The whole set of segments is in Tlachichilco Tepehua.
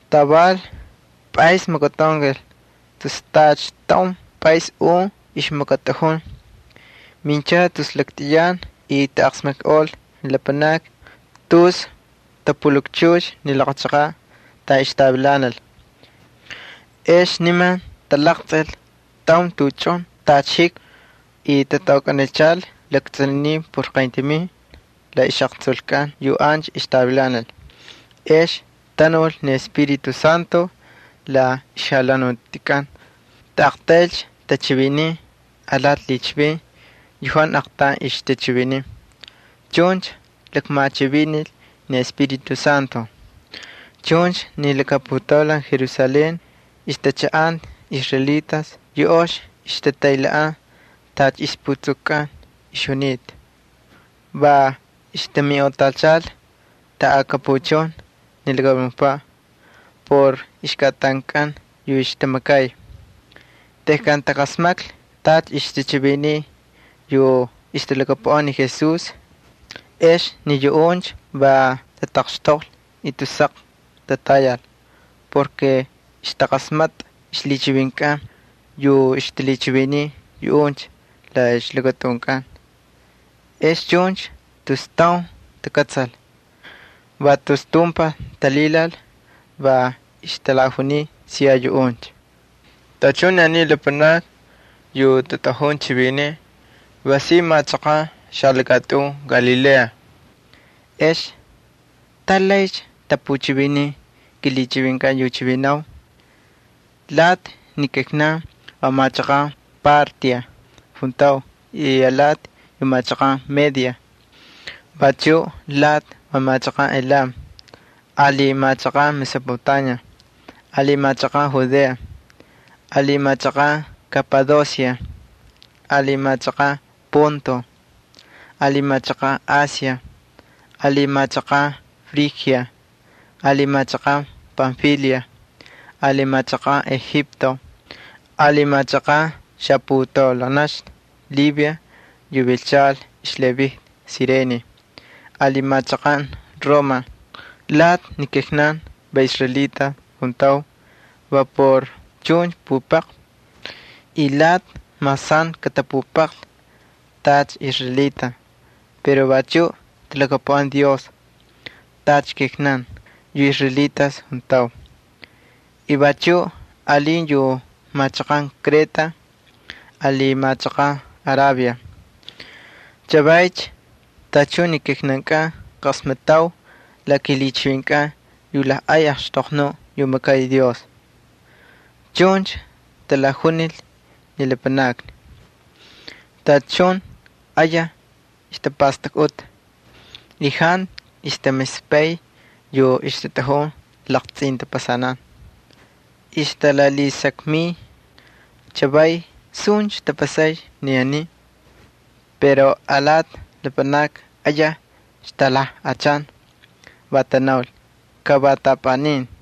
Taval pꞌaysni makatꞌaunkal, tus tacha taun pꞌays un ixmakatꞌajun. Minchal tus laktꞌiyan y taqasmakꞌol ni lapanakni tus tapulakchux ni laqa chaqaꞌ taꞌan ixtavilanal. Ex niman talaqtsꞌil taun tuꞌuchun tacha jikmi, y tataukꞌanichal laktsꞌuninin por qayntamin la ixꞌaqtsulkꞌan yu ancha ixtavilanal. Ex tanul ni Espíritu Santo la ixjalhanutikꞌan. Taꞌaqtaylcha tachiviniy alati lhichivin yu jantu aqtaun ixtachiviniy. Chuncha lakmachivinil ni Espíritu Santo. Chuncha ni laka putaulan Jerusalén ixtachaꞌanta israelitas yu ox ixtataylhaꞌan tacha ixputsukukꞌan ixjunita, va ixtaminꞌotachal taꞌakapuchun ni lakamunukpaꞌ por ixkꞌatankꞌan yu ixtamakay. Tejkan taqasmaklhi tacha ixtachiviniy yu ixtalhakapuꞌan ni Jesús, ex ni yuꞌuncha va tataqxtoqlhi y tus saq tatayal porke ixtaqasmatꞌa ixlhichivinkꞌan yu ixtalhichiviniy yuꞌuncha la ixlakatꞌunkꞌan. Ex chuncha tus taun takꞌatsal. Va tus tumpaj talhilal, va ixtalajuniy siya yuꞌuncha: —Tachun ni aniy lapanakni yu tatꞌajun chivinin va si machaqan xalakatꞌun Galilea. ¿Ex tas laycha tapuchiviniy kilhichivinkꞌan yu chivinanau? Lati ni kijnankꞌan va machaqan Partia juntau, y lati va machaqan Media, vachu lati va machaqan Elam ali machaqan Mesopotamia, ali machaqan Judea, ali machaqan Kapadosia, ali machaqan Ponto, ali machaqan Asia, ali machaqan Frigia, ali machaqan Panfilia, ali machaqan Egipto, ali machaqan xaputaulanaxna Libia yu vilchal xlhiꞌavintꞌi Cirene, ali machaqan Roma. Lati ni kijnankꞌan va israelitas juntau va por chuncha pupaqvi, y lati mas jantu katapupaqlhi tacha israelitas pero vachu talhakapuꞌan Dios tacha kijnankꞌan yu israelitas juntau. Y vachuꞌ alin yu machaqan Kreta ali machaqan Arabia. Chavaycha tachun ni kijnankꞌan qasmatꞌau la kilhichivinkꞌan yu lajꞌay axtoqnuꞌ yu makay Dios —chuncha talajunil ni lapanakni. Tachun ayaj ixtapastakꞌuta, y jantu ixtamispay yu ixtatꞌajun laqtsꞌintapasanan. Ixtalalhisakmiy: —¿Chavaycha suncha tapasaycha ni aniy? Pero alati lapanakni ayaj ixtalajꞌachan, va tanaul: —Ka va taꞌapꞌanin.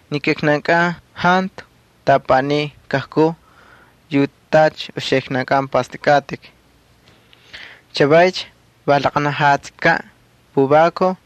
Ni kijnankꞌan jantu taꞌapꞌanin kajkuu yu tacha uxiknankꞌan pꞌastꞌakꞌatꞌik. Chavaycha va laqanajatsikaꞌ puvakuj.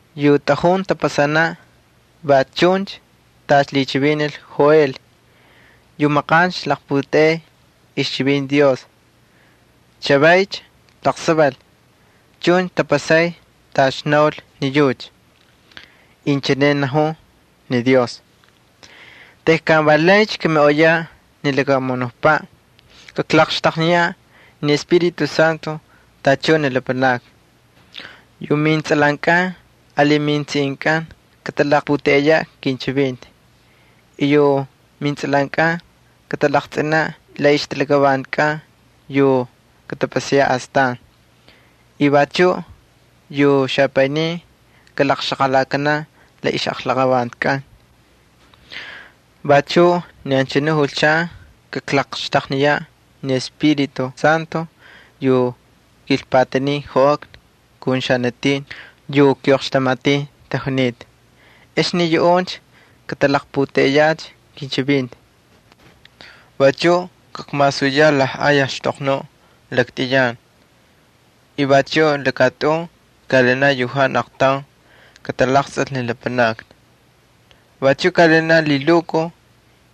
Yu tꞌajun tapasanaꞌ va chuncha tacha lhichivinil Joel yu maqancha ixlaqputeꞌey ixchivinti Dios, va naul: Inchine najun ni Dios, tejkan valaycha kamiꞌoyaꞌ ni lakamunukpaꞌ kaklaqxtaqniyaꞌ ni Espíritu Santo tachun ni lapanakni. Yu mintsꞌalankꞌan ali metsiꞌinkꞌan katalaqputeꞌeyaꞌ kinchivinti. Yu mintsꞌalankꞌan katalaqtsꞌinaꞌ la ixtalakavantikꞌan yu katapasayaꞌ astan. Vachu yu xapaynin kalaqxaqalakanaꞌ la ixꞌaqlaqavantikꞌan. Vachuꞌ ni anchanu julchan kaklaqxtaqniyaꞌ ni Espíritu Santo yu joꞌakna ali xanatin yu kiꞌoqxtamatin tajunita, ex ni yuꞌuncha katalaqputeꞌeyacha kinchivinti. Vachuꞌ kakmasuyaꞌ lajꞌay axtoqnuꞌ laktꞌiyan. Vachuꞌ lakatꞌun kaꞌalinaꞌ yu jantu aqtaun katalaqtsꞌil ni lapanakni: Kaꞌalinaꞌ lhilukuj,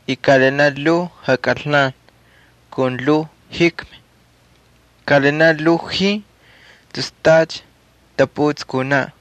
lhuu jakꞌalnan, lhuu jikmi, ali lhuu jin tus tacha taputsꞌi kunaꞌ.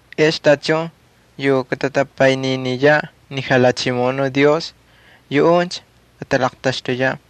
Ex tachun yu katatapayniniyaꞌ ni Jalhachimoꞌonuꞌ Dios, yuꞌuncha katalaqtaxtuyaꞌ.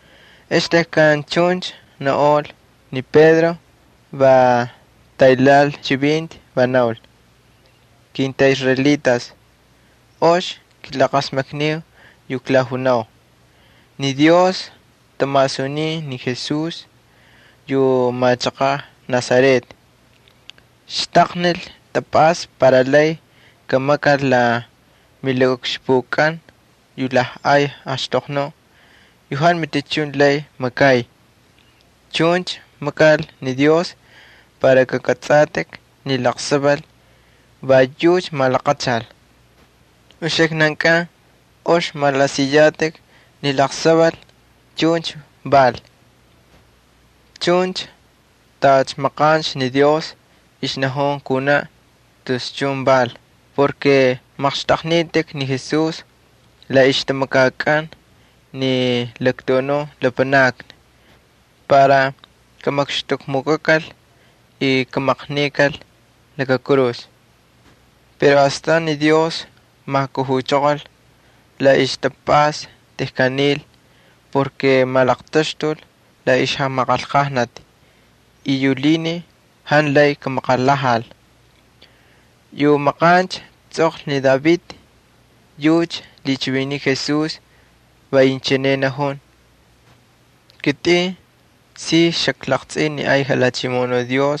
Ex ni Pedro va taylhaꞌal ixchivinti, va naul: —Kintꞌaꞌisraelitas, ox kilaqasmakniu yu klajunau: Ni Dios tamasunin ni Jesús yu machaqaꞌ Nazaret. Xtaqnil ixtapꞌasta para lay kamakal la milakaꞌukxpukꞌan yu lajꞌay axtoqnuꞌ yu jantu matichun lay makay. Chuncha makal ni Dios para kakꞌatsꞌatꞌik ni laqsaval va yucha malaqachal. Uxiknankꞌan ox malaꞌasiyatꞌik ni laqsaval chuncha val. Chuncha tacha maqancha ni Dios ixnajun kunaꞌ tus chun val. Va maqxtꞌaqnitꞌik ni Jesús la ixtamakakꞌan ni laktuꞌunun lapanakni para kamakxtukmukꞌakal y kamaqnikal laka kurus. Pero astan ni Dios majkujuchoqol la ixtapꞌasta tejkan nil. Va malaqtaxtul la ixjamaqanlqajnati y yu lhinin jantu lay kamaqalhajal. Yu maqancha tsꞌoqlhi ni David yucha lhichiviniy Jesús va inchine najun: Kitꞌin si xaklaqtsꞌin ni ay Jalhachimoꞌonuꞌ Dios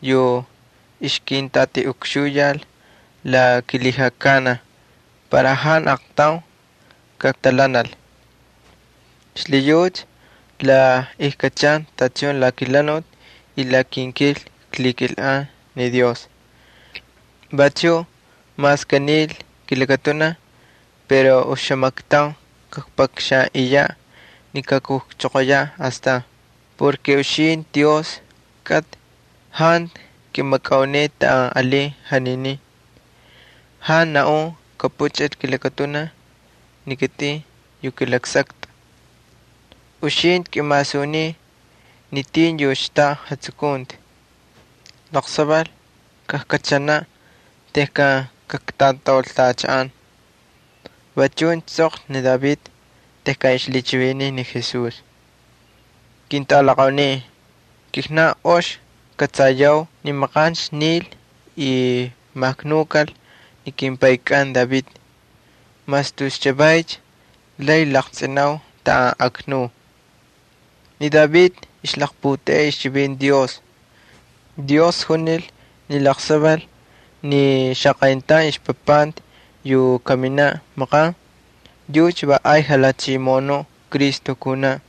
yu ixkintꞌatiꞌukxuyal para jantu aqtaun kaktalhanal, xlhiyucha la ijkꞌachan tachun la kelhanuti y la kinkil ay ikmakay ni Dios. Vachuꞌ mas kanil kilakatunaj pero oxamaktaun kakpakxanꞌiyaꞌ ni kajkujchoqoyaꞌ astan. Porke uxintꞌi, Dios kꞌatꞌi, jantu kꞌimakꞌauneꞌe taꞌan alin janinin. Jantu naꞌun kapuchꞌil kilakatunaj ni kitꞌin yu kꞌilaksaktꞌa. Uxintꞌi kꞌimasunin ni tin yu xtaꞌa jatsukunti. Laqsaval kajkꞌachanaꞌ tejkan kaktꞌataultachaꞌan. Va chuncha tsꞌoqlhi ni David tejkan ixlhichiviniy ni Jesús. Ketꞌalaqaunin, kijnan ox kꞌatsayau ni maqancha nil y maknukal ni kimpaykꞌan David. Mas tus chavaycha lay laqtsꞌinau taꞌan aknuy. Ni David ixlaqputeꞌey ixchivinti Dios. Dios junil ni laqsaval ni xaqayntaun ixpapanti yu kaminaꞌ maqan yucha va ay jalhachimoꞌonuꞌ Cristo kunaꞌ.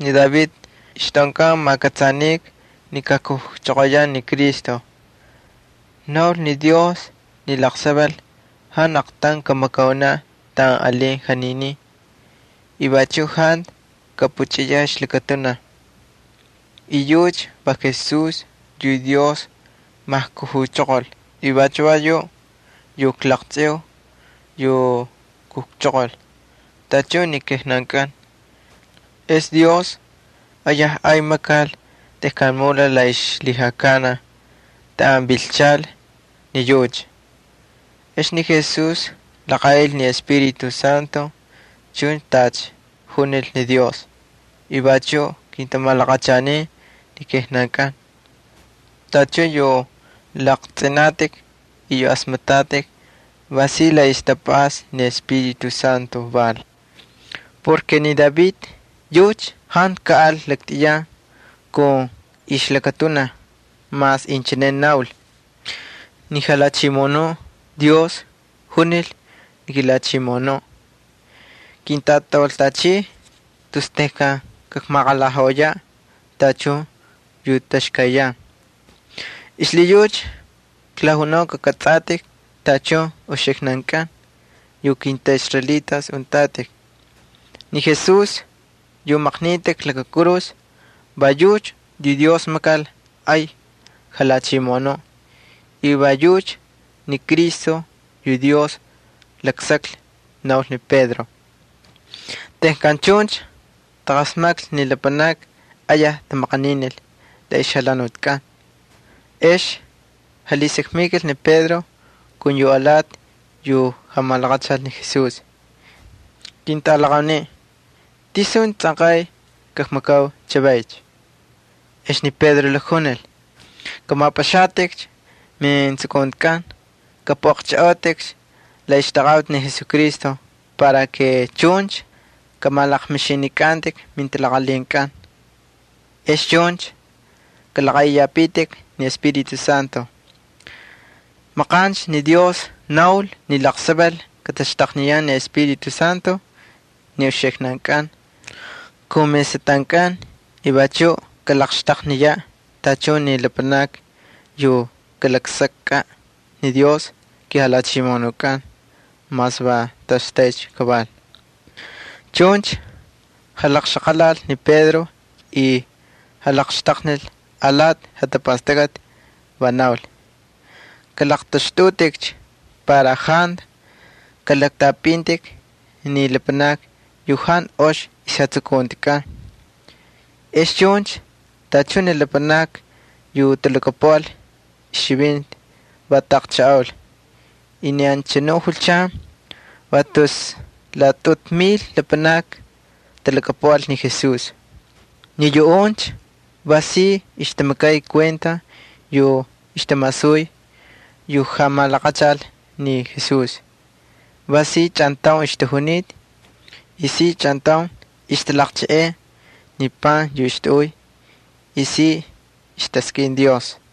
Ni David ixtꞌaunkan makꞌatsanika ni kakujchoqoyaꞌ ni Cristo. Naul ni Dios ni laqsaval jantu aqtaun kamakaunaꞌ taꞌan alin janinin, y vachuꞌ jantu kapuchꞌiyaꞌ ixlakatunaj. Y yucha va Jesús yu Dios majkujuchoqol y vachu va yuꞌ yu klaqtsꞌiu yu kujchoqol tachun ni kijnankꞌan. Ex ni Dios ayaj ay makal tejkan mulal la ixlhijakanaj taꞌan vilchal ni yucha. Ex ni Jesús laqaꞌil ni Espíritu Santo chuncha tacha junil ni Dios. Vachuꞌ kintamalaqachanin ni kijnankꞌan. Tachun yu laqtsꞌinatꞌik y yu asmatꞌatꞌik va si la ixtapꞌasta ni Espíritu Santo val. Ni David yucha jantu kaꞌal laktꞌiyan kun ixlakatunaj mas inchine naul: Ni Jalhachimoꞌonuꞌ Dios junil ni kiJalhachimoꞌonuꞌ Cristo: “Kintꞌatꞌaultꞌachiy la kilhijakanaj” tus tejkan kakmaqalhajaꞌoyaꞌ tachun yu taxkayyan. ’Xlhiyucha klajunau kakꞌatsꞌatꞌik tachun uxiknankꞌan yu kintꞌaꞌisraelitas untꞌatꞌik. Ni Jesús yu maqnitꞌik laka kurus va yucha yu Dios makal ay Jalhachimoꞌonuꞌ y va yucha ni Cristo yu Dios laksaklhi —naul ni Pedro. Tejkan chuncha taqasmaklhi ni lapanakni ayaj tamaqaninil la ixjalhanutikꞌan. Ex jalhisakmikal ni Pedro kun yu alati yu jamalaqachal ni Jesús: —Ketꞌalaqaunin, ¿tisuncha tsꞌanqay kakmakau chavaycha? Ex ni Pedro lakjunil: —Kꞌamapꞌaxatꞌik mijatapastakꞌatkꞌan, kꞌapꞌuꞌaqchꞌajꞌautꞌikcha la ixtaqaꞌuti ni Jesucristo para kꞌamalaqmixinikꞌantꞌik mintalaqalhinkꞌan. Ex chuncha kꞌalaꞌaꞌiyapitik ni Espíritu Santo. Maqancha ni Dios naul ni laqsaval kataxtaqniyan ni Espíritu Santo ni uxiknankꞌan kun mesꞌatꞌankꞌan y vachuꞌ kalaqxtaqniyaꞌ tachun ni lapanakni yu kalaksakꞌaꞌ ni Dios kiJalhachimoꞌonukꞌan mas va toꞌoxtaycha kaval. Chuncha jalaqxaqalal ni Pedro y jalaqxtaqnil alati jatapastakꞌati. Va naul: —Kꞌalaqtꞌaxtꞌutꞌikcha para jantu kalaktꞌapꞌintꞌik ni lapanakni yu jantu ox ixjatsukuntikꞌan. Ex chuncha tachun ni lapanakni yu talhakapuꞌal ixchivinti va taꞌaqchajꞌaul. Y ni anchanu julchan va tus laꞌatꞌutu mil lapanakni talhakapuꞌal ni Jesús. Ni yuꞌuncha va si ixtamakay kuenta yu ixtamasuy yu jamalaqachal ni Jesús. Va si chꞌantaun ixtajunita, y si chꞌantaun ixtalaqcheꞌey ni pan yu ixtaꞌuy, y si ixtaskꞌin Dios.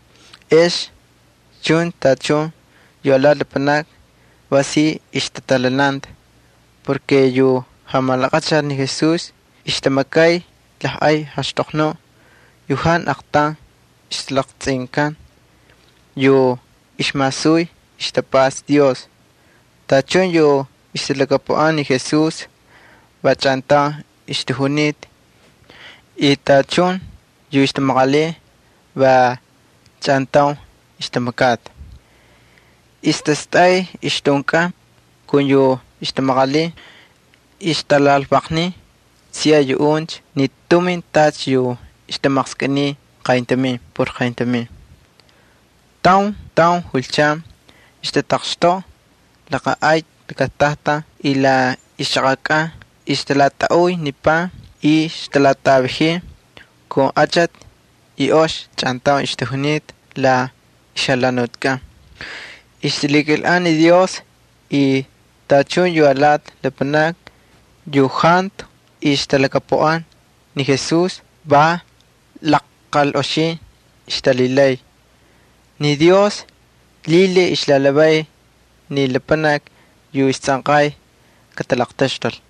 Ex chuncha tachun yu alati lapanakni va si ixtatalhananta porke yu jamalaqachal ni Jesús ixtamakay lajꞌay axtoqnuꞌ yu jantu aqtaun ixlaqtsꞌinkan, yu ixmasuy ixtapꞌasta Dios. Tachun yu ixtalhakapuꞌan ni Jesús va chꞌantaun ixtajunita y tachun yu ixtamaqalin va chꞌantaun ixtamakata. Ixtastꞌay ixtꞌunkꞌan kun yu ixtamaqalin, ixtalalvaqniy siya yuꞌuncha ni tumin tacha yu ixtamaqskꞌiniy qayntamin por qayntamin. Taun taun julchan ixtataqxtoꞌa laka ay lakatajtan y la ixchaqakꞌan ixtalatꞌaꞌuy ni pan y ixtalatꞌavajin kun achati y ox chꞌantaun ixtajunita la ixjalhanutikꞌan. Ay ixtamakay ni Dios y tachun yu alati lapanakni yu jantu ixtalhakapuꞌan ni Jesús va lajqalꞌoxin ixtalhilay. Ni Dios lhilhiy ixlalhavay ni lapanakni yu istsꞌanqay katalaqtaxtul.